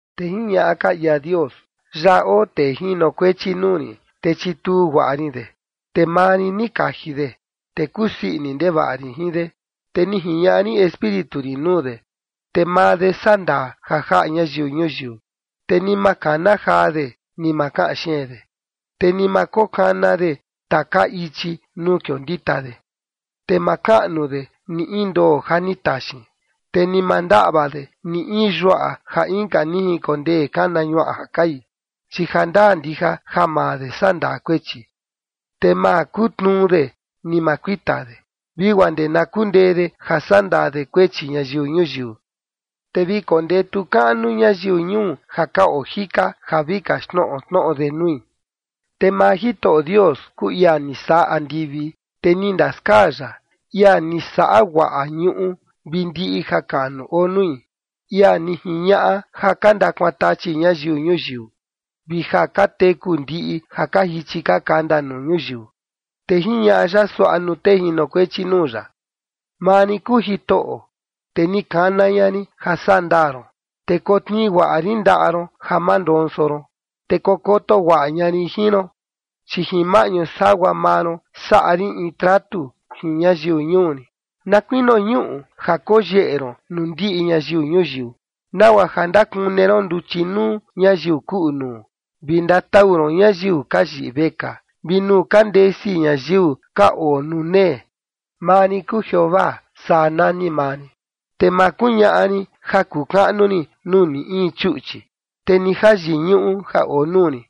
Te jiñaꞌa ka ia Dios: Yaꞌa oo tee jinokuechi nuu rin, te chituu guaꞌa rin de. Te maa rin ni kaji de, te kusii ini ndevaꞌa rin jin de. Te ni jiñaꞌa rin Espíritu rin nuu de, te maa de sandaa ja jaꞌa ñayiu ñuyiu. Te ni ma kana jaa de, ni ma kaꞌan xeen de, te ni ma kokana de taka ichi nuu kiondita de. Te ma kaꞌnu de ni in ndoo ja ni taxin, te ni ma ndaꞌva de ni in yuaꞌa ja inka ni jinkondee kana ñuaꞌa ja kai. Chi jandaa ndija ja maa de sandaa kuechi. Te ma kutnuu de, ni ma kuita de vi guaa ndee na kundee de ja saꞌa ndaa de kuechi ñayiu ñuyiu. Te vi kondetu kaꞌnu ñayiu ñuu ja ka oo jika ja vi kaxtnoꞌo tnoꞌo de nui. Te maa Jitoꞌo Dios kuu ia ni saꞌa andivi, te ni ndaskaa ya, ia ni saꞌa guaꞌa ñuꞌu vi ndiꞌi jakaꞌnu oo nui, ia ni jiñaꞌa ja ka ndakuantachi ñayiu ñuyiu, vi ja ka teku ndiꞌi ja ka jichi ka kanda nuu ñuyiu. Te jiñaꞌa ya suaꞌa nuu tee jinokuechi nuu ya: “Maa rin kuu Jitoꞌo, te ni kana ña rin ja saꞌa ndaa ron, te kotnii guaꞌa rin ndaꞌa ron ja ma ndonso ron, te kokoto guaꞌa ña rin jin ron, chi jin maꞌñu sagua maa ron saꞌa rin in tratu jin ñayiu ñuu rin, na kuinio ñuꞌu ja koyeꞌe ron nuu ndiꞌi ñayiu ñuyiu, nagua ja ndakune ron nduchi nuu ñayiu kuꞌu nuu, vi ndatau ron ñayiu ka yiꞌi vekaa vi nuu ka ndesi ñayiu ka oo nuu nee. Maa rin kuu Jeovaa, saa nani maa rin, te ma kuñaꞌa rin ja kuu kaꞌnu rin nuu ni in chuꞌchi, te ni jayiñuꞌu ja oo nuu rin.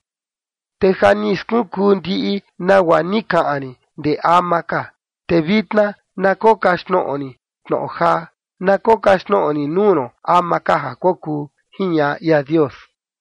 Te ja ni skunkuu ndiꞌi nagua ni kaꞌan rin ndee ama ka. Te vitna na kokaxtnoꞌo rin tnoꞌo jaa, na kokaxtnoꞌo rin nuu ron ama ka ja kokuu”, jiñaꞌa ia Dios.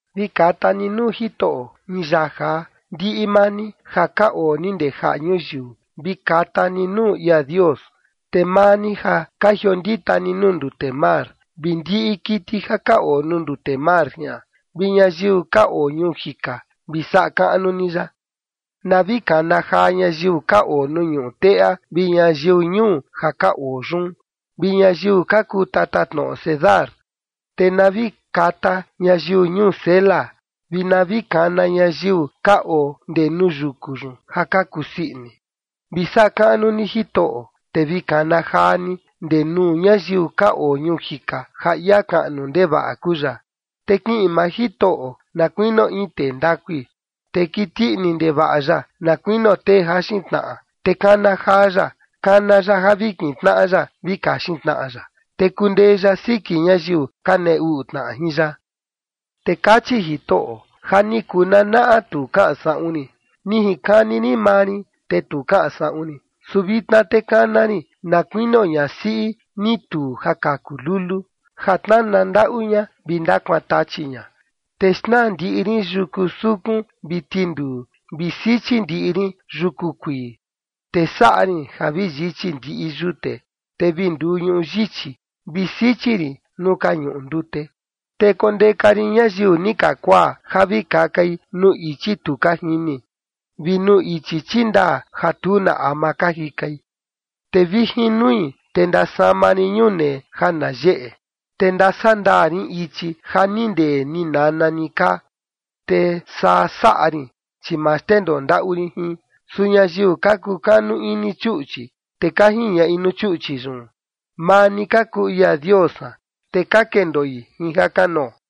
Vi kata ni nuu Jitoꞌo in yaa jaa, ndiꞌi maa ni ja ka oo ni ndee jaꞌa ñuyiu, vi kata ni nuu ia Dios. Te maa ni ja ka jiondita ni nuu ndute mar, vi ndiꞌi kiti ja ka oo nuu ndute mar jian, vi ñayiu ka oo ñuu jika, vi saꞌa kaꞌnu ni ya. Na vi kana jaa ñayiu ka oo nuu ñuꞌu teꞌa vi ñayiu ñuu ja ka oo yun, vi ñayiu ka kuu tatatnoꞌo Cedar, te na vi kata ñayiu ñuu Sela, vi na vi kana ñayiu ka oo ndee nuu yuku yun ja ka kusii ini. Vi saꞌa kaꞌnu ni Jitoꞌo, te vi kana jaa ni ndee nuu ñayiu ka oo ñuu jika ja ia kaꞌnu ndevaꞌa kuu ya. Te kiꞌin maa Jitoꞌo na kuinio in tee ndakui, te kiti ini ndevaꞌa ya na kuinio tee jaxin tnaꞌa, te kana jaa ya, kana ya ja vi kintnaꞌa ya vi kaxin tnaꞌa ya, te kundee ya siki ñayiu ka nee uꞌu tnaꞌa jin ya. Te kachi Jitoꞌo: Ja ni kuu nanaꞌa tu kaꞌan saꞌun rin, ni jinkani rin maa rin, te tu kaꞌan saꞌun rin. Su vitna te kana rin na kuinio ñasiꞌi ni tuu ja kaku lulu ja tnana ndaꞌu ña vi ndakuaan tachi ña. Te xnaa ndiꞌi rin yuku sukun vi tinduu vi sichi ndiꞌi rin yuku kuii, te saꞌa rin ja vi yichi ndiꞌi yute, te vi nduu ñuꞌu yichi, vi sichi rin nuu ka junkuꞌun ndute. Te kondeka rin ñayiu ni ka kuaa ja vi kakai nuu ichi tu ka jini, vi nuu ichi chindaa ja tu na ama ka jikai. Te vi jin nui, te ndasama rin ñunee ja na yeꞌe, te ndasaꞌa ndaa rin ichi ja ni ndee ni nana ni kaa, te saa saꞌa rin, chi ma xndendoo ndaꞌu rin jin. Su ñayiu ka kukanu ini chuꞌchi, te ka jiñaꞌi nuu chuꞌchi yun: “Maa ni ka kuu ia dios san”, te ka kendoi jin jakanoo.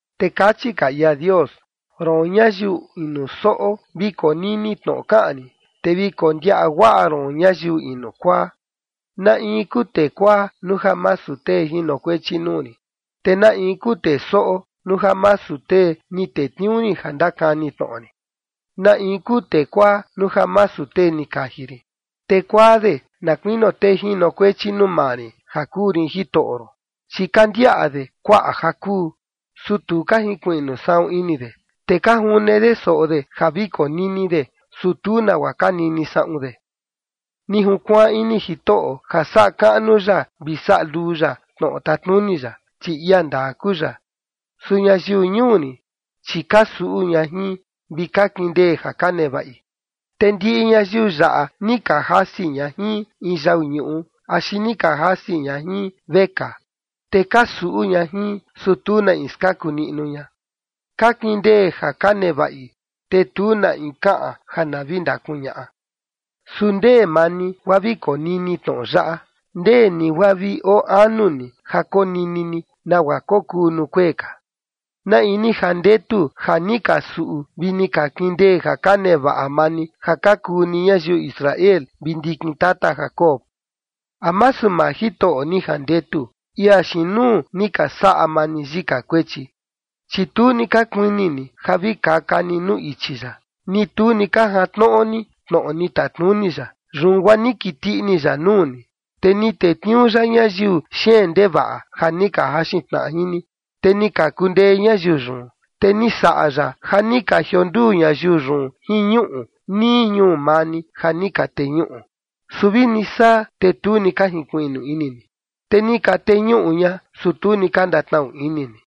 Te kachi ka ia Dios: Roon, ñayiu inu soꞌo, vi konini tnoꞌo kaꞌan rin te vi kondiaꞌa guaꞌa ron ñayiu inu kuaa. ¿Na in kuu tee kuaa nuu ja masu tee jinokuechi nuu rin? ¿Te na in kuu tee soꞌo, nuu ja masu tee ni tetniuu rin ja ndakani tnoꞌo rin? ¿Na in kuu tee kuaa nuu ja masu tee ni kaji rin? Te kuaa de na kuinio tee jinokuechi nuu maa rin ja kuu rin Jitoꞌo ron. Chi ka ndiaꞌa de kuaꞌa ja kuu, su tu ka jinkuiꞌnu saꞌun ini de. Te ka june de soꞌo de ja vi konini de, su tu nagua ka nini saꞌun de. Ni junkuaan ini Jitoꞌo ja saꞌa kaꞌnu ya vi saꞌa luu ya tnoꞌo tatnuni ya, chi ia ndaa kuu ya. Su ñayiu ñuu rin, chi ka suꞌu ña jin vi ka kindee ja ka nevaꞌi, te ndiꞌi ñayiu yaꞌa ni ka jasi ña jin in yau ñuꞌu axi ni ka jasi ña jin vekaa, te ka suꞌu ña jin, su tu na in skaku niꞌnu ña. Ka kindee ja ka nevaꞌi, te tu na in kaꞌan ja na vi ndakuñaꞌa. ¿Su ndee maa ni guaa vi konini tnoꞌo yaꞌa? ¿Ndee ni guaa vi oo anu ni ja konini ni nagua kokuu nuu kuee ka? ¿Na in ni jandetu ja ni ka suꞌu vi ni ka kindee ja ka nevaꞌa maa ni ja ka kuu ni ñayiu Israel vi ndikin tata Jacob? ¿A masu maa Jitoꞌo ni jandetu, ia xiin nuu ni ka saꞌa maa ni yika kuechi? Chi tu ni ka kuini ni ja vi kaka ni nuu ichi ya, ni tu ni ka jantnoꞌo ni tnoꞌo ni tatnuni ya. Yun guaa ni kiti ini ya nuu ni, te ni tetniuu ya ñayiu xeen ndevaꞌa ja ni ka jaxin tnaꞌa jin ni, te ni ka kundee ñayiu yun. Te ni saꞌa ya ja ni ka jionduu ñayiu yun jin ñuꞌu nii ñuu maa ni ja ni ka teñuꞌu. Su vini saa, te tu ni ka jinkuiꞌnu ini ni. Te ni ka teñuꞌu ña, su tu ni ka ndatnaꞌu ini ni.